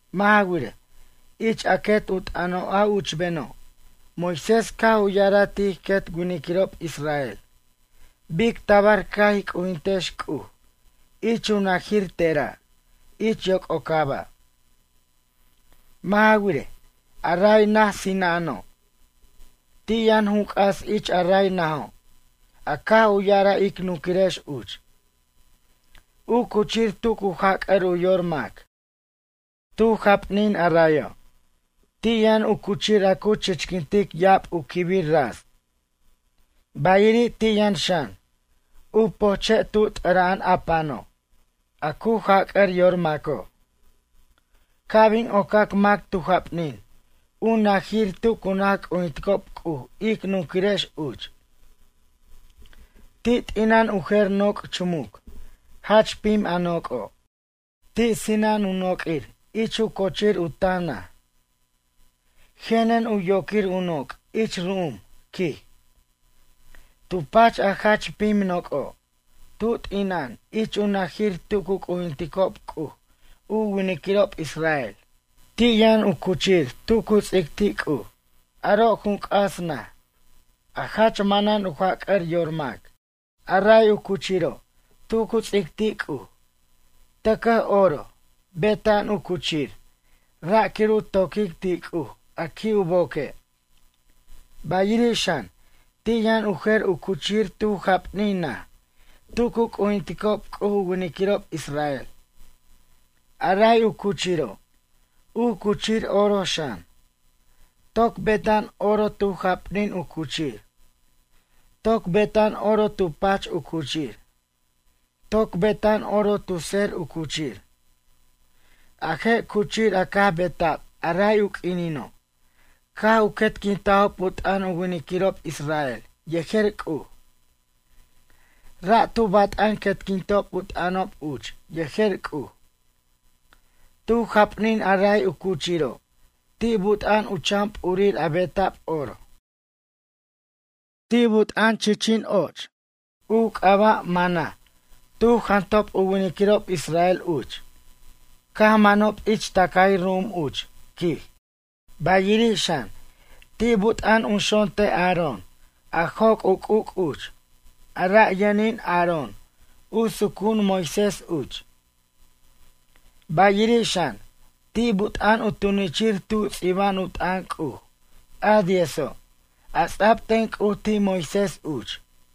Mʌ' ja wirej, ich a quet u t'ʌno' a uchbeno' Moisés caj u ya'araj ti' ij quet winiquirob israel bic tabar ca' ij c'ujintex C'uj ich u najir tera' ich yoc'ocaba'. Mʌ' ja wirej, a ray naj sina'ano'. Ti' yʌn jun c'as ich a ray najo' a caj u ya'araj ic nunquirex uch: “U cuchir tu cu jac'ar u yor mac.” Tu japnin arayo', ti' yʌn u cuchir a cu ch'iquintic ya'ab u quibir ras, bayiri' ti' yʌn xan, u pojche' tu t'ʌra'an a pano', a cu jac'ar yor maco'. Ca' bin ocac mac tu japnin u najir tu cu naj c'ujinticob C'uj ic nunquirex uch. Ti' t'ina'an u jer noc' chumuc, jach pim a noc'o'. Ti' sina'an u noq'uir ich u co'chir u tan naj. Jenen u yoquir u noc' ich ru'um, quij. Tu pach a jach pim noc'o', tu t'ina'an ich u najir tu cu c'ujinticob C'uj u winiquirob israel, ti' yʌn u cuchir tu cu ts'ic ti' C'uj. Aro' jun c'as naj, a jach manan u jac'ar yor mac. A ray u cuchiro' tu cu ts'ic ti' C'uj, tʌcʌj oro beta'an u cuchir ra' quir u to'quic ti' C'uj a qui' u boque'. Bayiri', xan, ti' yʌn u jer u cuchir tu japnin naj tu cu c'ujinticob C'uj u winiquirob israel. A ray u cuchiro', u cuchir oro xan. Toc beta'an oro tu japnin u cuchir. Toc beta'an oro tu pach u cuchir. Toc beta'an oro tu tser u cuchir. A je' cuchir a caj beta'b a ray u q'uinino caj u quetquintajob u t'ʌn u winiquirob israel yejer C'uj. Ra' tu bat'an quetquintob u t'ʌnob uch yejer C'uj. Tu japnin a ray u cuchiro' ti' buta'an u chan p'urir a beta'b oro. Ti' but'a'an chichin och, u c'aba' mana tu jantajob u winiquirob israel uch caj manob ich tʌcay ru'um uch, quij. Bayiri', xan, ti' but'a'an u xonte' Aarón a joc' u c'uc' uch a ra' yʌnin Aarón u sucu'un Moises uch. Bayiri' xan, ti' but'a'an u tunichir tu ts'iba'an u t'ʌn C'uj, a diezo', a ts'a'b ten C'uj ti' Moisés uch.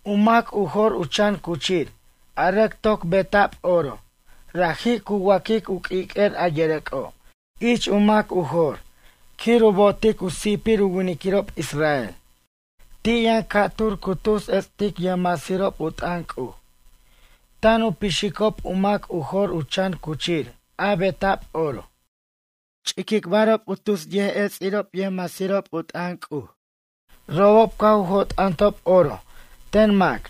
U mac u jor u chan cuchir a rʌc toc beta'b oro ra'ji' cu wa'quic u q'uiq'uer a yʌrʌc'o' ich u mac u jor quir u bo'otic u si'pir u winiquirob israel. Ti' yʌn ca'tur cu tus ets'tic yʌjmasirob u t'ʌn C'uj, tan u pixicob u mac u jor u chan cuchir a beta'b oro, ch'iquicbarob u tus yʌjets'irob yʌjmasirob u t'ʌn C'uj. Robob caj u jo't'antob oro ten mac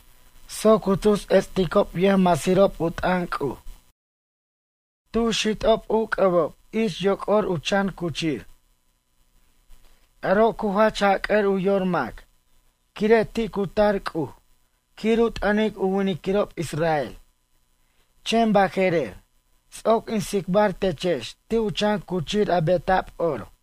soc u tus ets'ticob yʌjmasirob u t'ʌn C'uj. Cu xit'ob u c'ʌbob ich yoc'or u chan cuchir. Aro' cu jach jac'ar u yor mac quire' ti' cu tar C'uj quir u t'ʌnic u winiquirob israel. Chen baje'rer ts'oc in tsicbar techex ti' u chan cuchir a beta'b oro.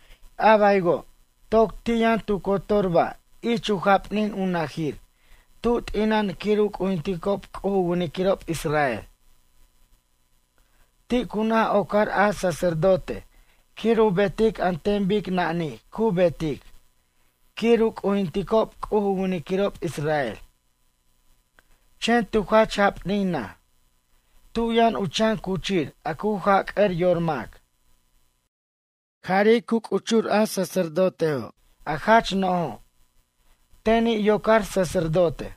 A baywo', toc ti' yʌn tu cotor ba' ich u japnin u najir tu t'ina'an quir u c'ujinticob C'uj u winiquirob israel. Ti' cu naj ocar a sacerdote quir u betic an ten bic nanij cu betic quir u c'ujinticob C'uj u winiquirob israel. Chen tu jach japnin naj, tu yʌn u chan cuchir a cu jac'ʌr yor mac. Jari' cu c'uchur a sacerdotejo' a jach no'jo', teni' yocar sacerdotej.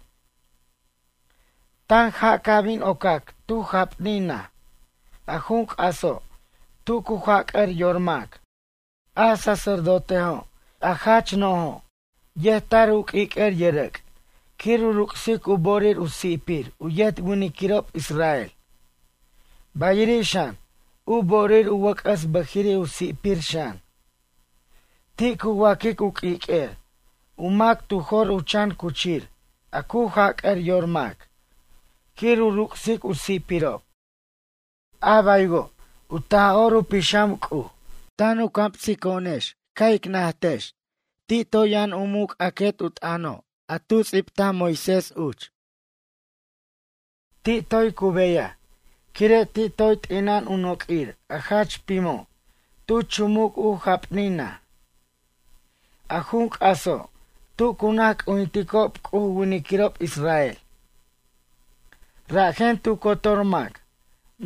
Tanja' ca' bin ocac tu japnin naj a jun c'aso' tu cu jac'ar yor mac. A sacerdotejo', a jach no'jo' yet tar u q'uiq'uer yʌrʌc' quir u ruc'sic u bo'orir u si'pir u yet winiquirob israel. Bayiri' xan, u bo'orir u wʌc'ʌs bʌjiri' u si'pir xan. Ti' cu waq'uic u q'uiq'uer u mac tu jor u chan cuchir a cu jac'ar yor mac quir u ruc'sic u si'pirob. A baywo', u Taj'or u Pixam C'uj tan u camsico'onex ca' ic najtejex ti' toy yʌn u muc' a quet u t'ʌno' a tu ts'ibtaj Moisés uch. Ti' toy cu beyaj quire' ti' toy t'ina'an u noq'uir a jach pimo' tu chumuc u japnin naj, a jun c'aso' tu cu naj c'ujinticob C'uj u winiquirob israel. Rajen tu cotor mac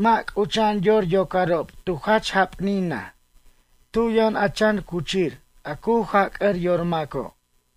mʌ' c'ucha'an yor yocarob tu jach japnin naj tu yʌn a chan cuchir a cu jac'ar yor maco'.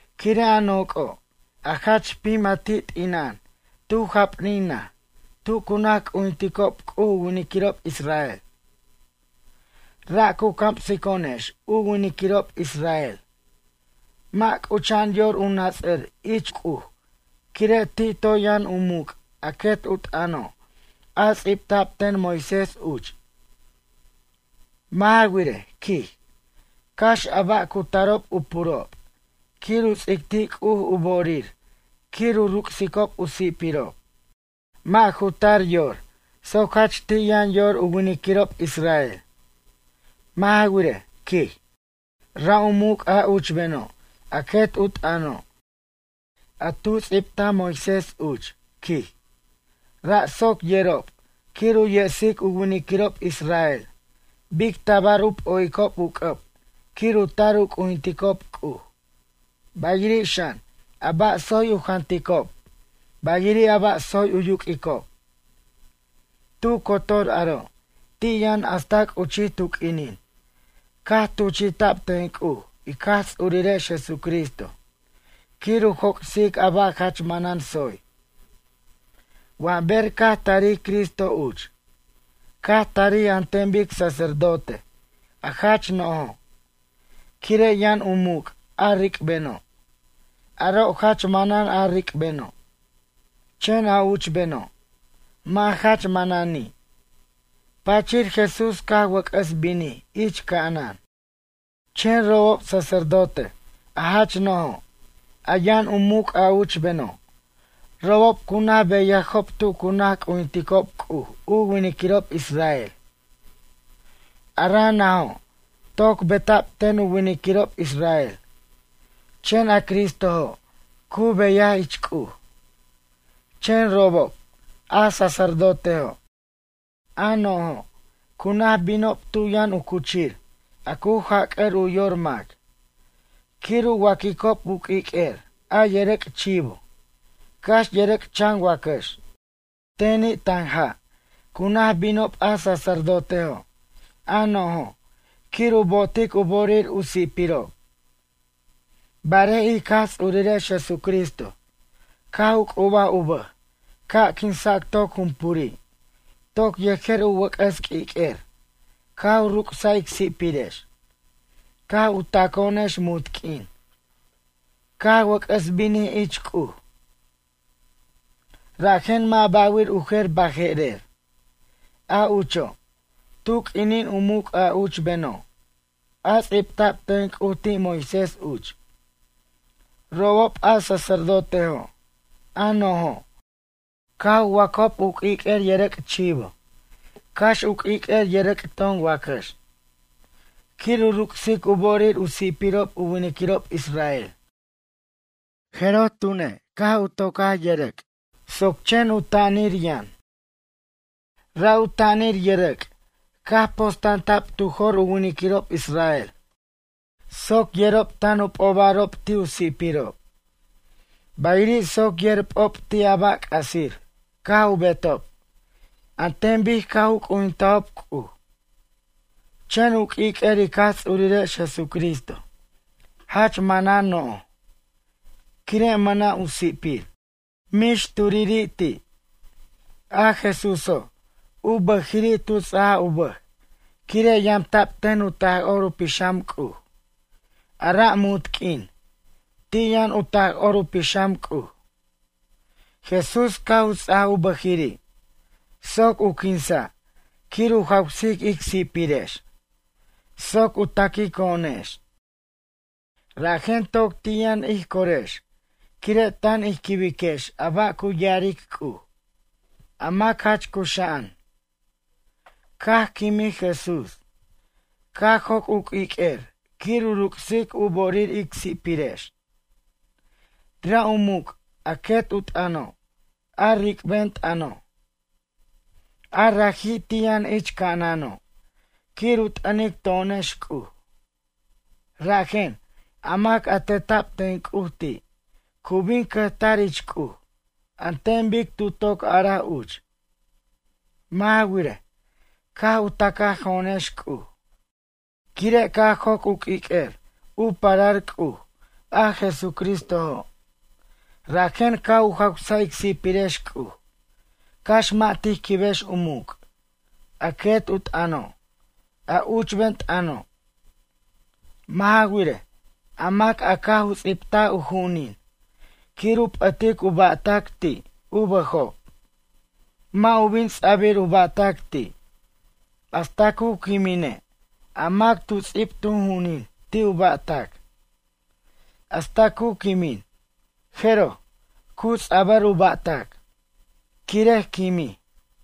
Quire' a noc'o', a jach pim a ti' t'ina'an tu japnin naj tu cu naj c'ujinticob C'uj u winiquirob israel. Ra' cu camsico'onex u winiquirob israel mʌ' c'ucha'an yor u nats'ar ich C'uj quire' ti' toy yʌn u muc' a quet u t'ʌno' a ts'ibta'b ten Moisés uch. Mʌ' ja wirej, quij, cax a ba' cu tarob u purob quir u ts'ic ti' C'uj u bo'orir quir u ruc'sicob u si'pirob. Mʌ' ju tar yor soc jach ti' yʌn yor u winiquirob israel. Mʌ' ja wirej, quij, ra' u muc' a uchbeno' a quet u t'ʌno', a tu ts'ibtaj Moisés uch, quij, ra' soc yerob quir u yesic u winiquirob israel bic tabar u p'o'icob u c'ʌb quir u tar u c'ujinticob C'uj, bayiri' xan, a ba' tsoy u janticob bayiri' a ba' tsoy u yuq'uicob. Tu cotor aro' ti' yʌn hasta c'uchij tu q'uinin caj tuchi'ta'b ten C'uj ic Jaj Ts'urirex Jesucristo quir u joc'sic a ba' jach manan tsoy. Wa ber caj tarij Cristo uch, caj tarij an ten bic sacerdote a jach no'jo', quire' yʌn u muc' a ric'beno', aro' jach manan a ric'beno', chen a uchbeno', mʌ' jach manani'. Pachir Jesús caj wʌc'ʌs binij ich ca'anan. Chen robob, sacerdote a jach no'jo', a yʌn u muc' a uchbeno', robob cu naj beyajob tu cu naj c'ujinticob C'uj u winiquirob israel. A ra' najo' toc beta'b ten u winiquirob israel, chen a Cristojo' cu beyaj ich C'uj. Chen robob, a sacerdotejo', a no'jo', cu naj binob tu yʌn u cuchir, a cu jac'ʌr u yor mac, quir u waq'uicob u q'uiq'uer a yʌrʌc' chivo, cax yʌrʌc' chan wacax. Teni' tanja' cu naj binob a sacerdotejo' a no'jo' quir u bo'otic u bo'orir u si'pirob. Barej ic Jaj Ts'urirex Jesucristo caj u c'ubaj u bʌj ca' quinsac toc jumpuri' toc yejer u wʌc'ʌs q'uiq'uer caj u ruc'saj ic si'pirex caj u taco'onex munt q'uin, caj wʌc'ʌs binij ich C'uj. Rajen mʌ' ba'wir u jer baje'rer. A ucho', tu q'uinin u muc' a uchbeno', a ts'ibtab ten C'uj ti' Moisés uch, robob a sacerdotejo', a no'jo', caj u wac'ob u q'uiq'uer yʌrʌc' chivo, cax u q'uiq'uer yʌrʌc' ton wacax, quir u ruc'sic u bo'orir u si'pirob u winiquirob israel. Jeroj tune' caj tocaj yʌrʌc' soc chen u ta'anir yʌn. Ra' u ta'anir yʌrʌc' caj po'stanta'b tu jo'r u winiquirob israel soc yerob tan u p'obarob ti' u si'pirob, bayiri' soc yer p'o'b ti' a ba' c'asir caj u betob an ten bic caj u c'ujintajob C'uj. Chen u q'uiq'uer ic Jaj Ts'urirex Jesucristo jach manan no'j, quire' mʌna' u si'pir, mix turiri' ti'. A Jesuso' u bʌjiri' tu ts'aj u bʌj quire' yamta'b ten u Taj'or u Pixam C'uj, ara' munt q'uin ti' yʌn u Taj'or u Pixam C'uj. Jesús caj u ts'aj u bʌjiri' soc u quinsa' quir u jawsic ic si'pirex soc u taquico'onex. Rajen toc ti' yʌn ij corex quire' tan ij quibiquex a ba' cu ya'aric C'uj, a mac jach cuxa'an. Caj quimij Jesús, caj joc' u q'uiq'uer quir u ruc'sic u bo'orir ic si'pirex, ra' u muc' a quet u t'ʌno' a ric'ben t'ʌno'. A raji' ti' yʌn ich ca'anano' quir u t'ʌnic to'onex C'uj. Rajen, a mac a teta'b ten C'uj ti' cu bin cʌjtar ich C'uj an ten bic tu toc araj uch. Mʌ' ja wirej, caj u tacajo'onex C'uj, quire' caj joc' u q'uiq'uer u parar C'uj a Jesucristojo', rajen caj u jawsaj ic si'pirex C'uj, cax mʌ' tij quibex u muc', a quet u t'ʌno', a uchben tʌno'. Mʌ' ja wirej, a mac a caj u ts'ibtaj u ju'unin quir u p'ʌtic u ba'tac ti' u bʌjob, mʌ' u bin ts'abir u ba'tac ti', hasta cu quimine' a mac tu ts'ib tu ju'unin ti' u ba'tac. Hasta cu quimin, jeroj, cu ts'abar u ba'tac, quire' quimij.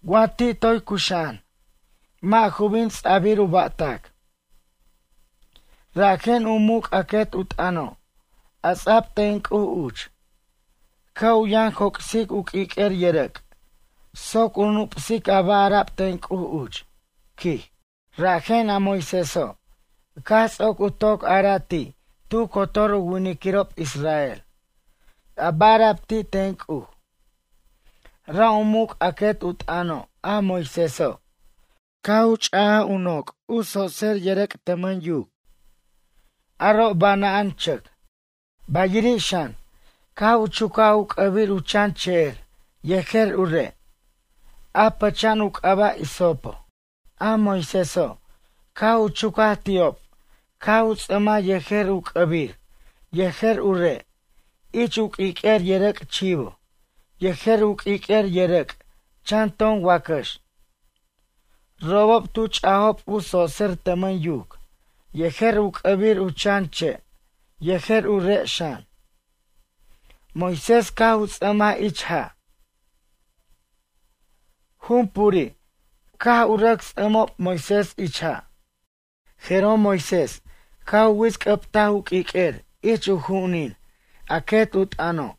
Wa ti' toy cuxa'an, mʌ' ju bin ts'abir u ba'tac. Rajen, u muc' a quet u t'ʌno', a ts'a'b ten C'uj uch, ca' u yʌn joc'sic u q'uiq'uer yʌrʌc' soc u nup'sic a ba' ara'b ten C'uj uch, quij. Rajen a Moiséso', caj ts'oc u toc ara'a' ti' tu cotor u winiquirob israel a ba' ara'b ti' ten C'uj. Ra' u muc' a quet u t'ʌno' a Moiséso', caj u ch'aj junoc u tsotser yʌrʌc' tʌmʌn yuc, aro' bana'an chʌc. Bayiri' xan, caj u chucaj u c'ʌbir u chan che'er yejer u re', a pʌcha'an u c'aba' hisopo. A Moiséso', caj u chucaj ti'ob caj u ts'ʌmaj yejer u c'ʌbir yejer u re' ich u q'uiq'uer yʌrʌc' chivo yejer u q'uiq'uer yʌrʌc' chan ton wacax. Robob tu ch'ajob u tsotser tʌmʌn yuc yejer u c'ʌbir u chan che' yejer u re' xan, Moisés caj u ts'ʌmaj ich ja'. Jum puri' caj u rʌc ts'ʌmob Moisés ich ja'. Jeroj Moisés caj u wits'c'ʌbtaj u q'uiq'uer ich u ju'unin a quet u t'ʌno'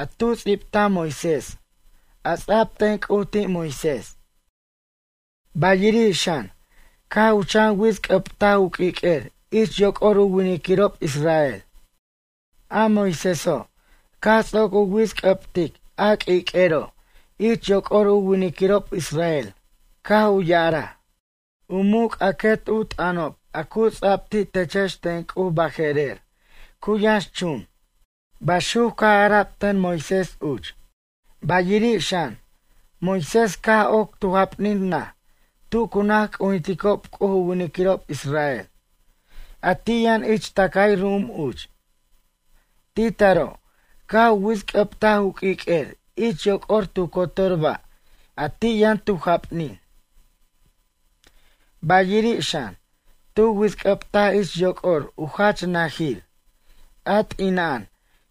a tu ts'bitaj Moisés a ts'ab ten C'uj ti' Moisés. Bayiri' xan, caj u chan wits'c'ʌbtaj u q'uiq'uer ich yoc'or u winiquirob israel. A Moiséso', caj ts'oc u wits'c'ʌbtic a q'uiq'uero' ich yoc'or u winiquirob israel caj u ya'araj: “U muc' a quet u t'ʌnob a cu ts'ab ti' techex ten C'uj baje'rer cu yʌnxchun.” Baxuc caj ara'b ten Moisés uch. Bayiri' xan, Moisés, caj oc tu japnin naj tu cu naj c'ujinticob C'uj u winiquirob israel, a ti' yʌn ich tʌcay ru'um uch. Ti' taro' caj u wits'c'ʌbtaj u q'uiq'uer ich yoc'or tu cotor ba' a ti' yʌn tu japnin. Bayirir xan, tu wits'c'ʌbtaj ich yoc'or u jach najir, a t'ina'an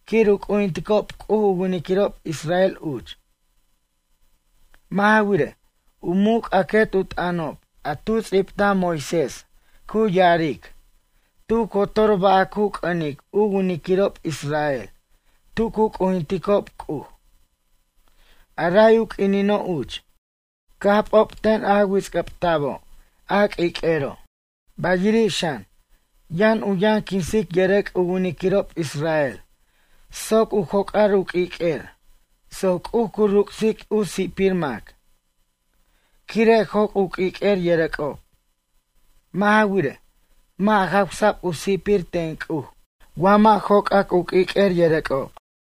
quir u c'ujinticob C'uj u winiquirob israel uch. Mʌ' ja wirej, u muc' a quet u t'ʌnob a tu ts'ibtaj Moisés cu ya'aric, tu cotor ba' a cu c'ʌnic u winiquirob israel tu cu c'ujinticob C'uj, a ray u q'uinino' uch, caj p'ob ten a wits'c'ʌbta'bo' a q'uiq'uero'. Bayiri' xan, yʌn u yʌn quinsic yʌrʌc' u winiquirob israel soc u joc'ar u q'uiq'uer soc C'uj cu ruc'sic u si'pir mac, quire' joc' u q'uiq'uer yʌrʌc'ob. Mʌ' ja wirej, mʌ' jawsa'b u si'pir ten C'uj wa mʌ' joc'ac u q'uiq'uer yʌrʌc'ob.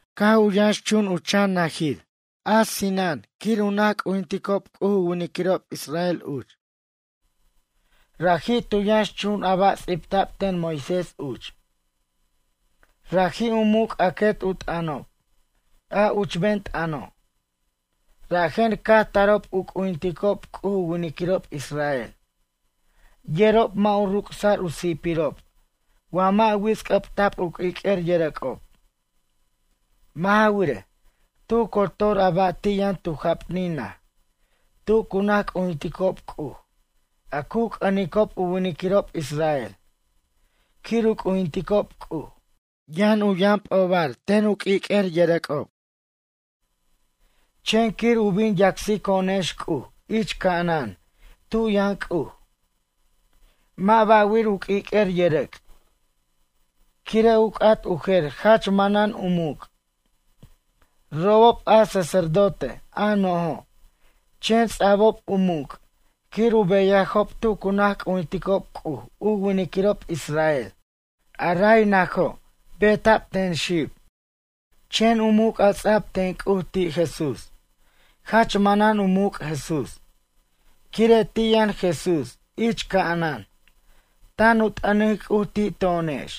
Caj u yʌnxchun u chan najir a sina'an quir u naj c'ujinticob C'uj u winiquirob israel uch, raji' tu yʌnx chun a ba' ts'ibta'b ten Moisés uch, raji' u muc' a quet u t'ʌnob, a uchben t'ʌno'. Rajen caj tarob u c'ujinticob C'uj u winiquirob israel yerob mʌ' u ruc'sa'r u si'pirob wa mʌ' wits'c'ʌbta'b u q'uiq'uer yʌrʌc'ob. Mʌ' ja wirej, tu cotor a ba' a ti' yʌn tu japnin naj tu cu naj c'ujinticob C'uj a cu c'ʌnicob u winiquirob israel quir u c'ujinticob C'uj yʌn u yʌn p'ob ten u q'uiq'uer yʌrʌc'ob. Chen quir u bin yacsico'onex C'uj ich ca'anan tu yʌn C'uj, mʌ' ba'wir u q'uiq'uer yʌrʌc', quire' u c'at u jer jach manan u muc'. Robob a sacerdote a no'jo', chen ts'a'bob u muc' quir u beyajob tu cu naj c'ujinticob C'uj u winiquirob israel, a ray najo' beta'b ten xib. Chen u muc' a ts'a'b ten C'uj ti' Jesús, jach manan u muc' Jesús, quire' ti' yʌn Jesús ich ca'anan tan u t'ʌnic C'uj ti' to'onex.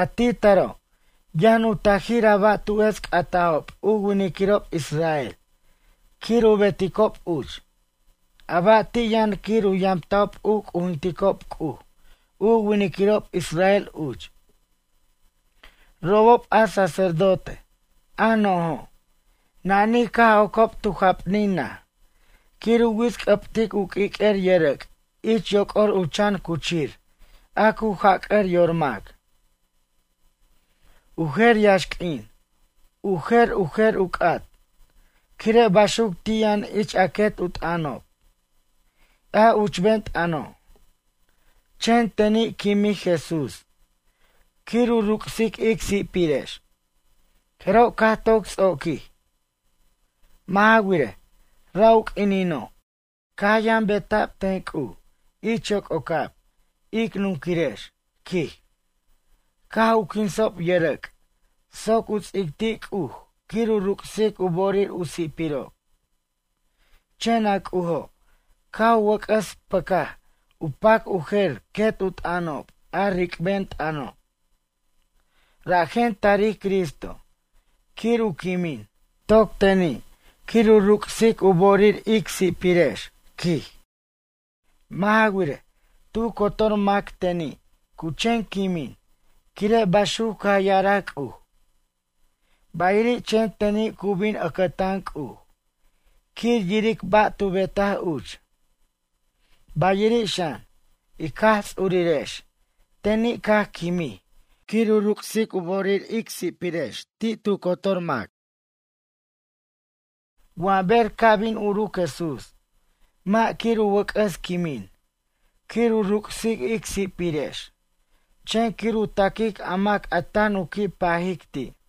A ti' taro', yʌn u tajir a ba' tu ets' catajob u winiquirob israel quir u beticob uch, a ba' ti' yʌn quir u yamta'ob u c'ujinticob C'uj u winiquirob israel uch. Robob a sacerdote, a no'jo', nanij caj ocob tu japnin naj quir u wits'c'ʌbtic u q'uiq'uer yʌrʌc' ich yoc'or u chan cuchir a cu jac'ʌr yor mac. U jer yaxq'uin u jer u jer u c'at, quire' baxuc ti' yʌn ich a quet u t'ʌnob, a uchben t'ʌno'. Chen teni' quimij Jesús quir u ruc'sic ic si'pirex, jeroj caj toc ts'oquij. Mʌ' ja wirej, ra' u q'uinino' caj yʌn beta'b ten C'uj ich yoc'ocab, ic nunquirex, quij, caj u quinsob yʌrʌc' soc u ts'ic ti' C'uj quir u ruc'sic u bo'orir u si'pirob. Chen a C'ujo' caj u wʌc'ʌs pʌcaj u pac u jer quet u t'ʌnob a ric'ben t'ʌno', rajen tarij Cristo quir u quimin toc teni' quir u ruc'sic u bo'orir ic si'pirex, quij. Mʌ' ja wirej, tu cotor mac teni' cu chen quimin quire' baxuc caj ya'araj C'uj. Bayiri' chen teni' cu bin ʌcʌtan C'uj quir yiric ba' tu betaj uch. Bayiri' xan, ic Jaj Ts'urirex teni' caj quimij quir u ruc'sic u bo'orir u si'pirex ti' tu cotor mac. Wa ber ca' bin uruc Jesús, mʌ' quir u wʌc'ʌs quimin quir u ruc'sic ic si'pirex chen quir u taquic a mac a tan u qui' pajic ti'.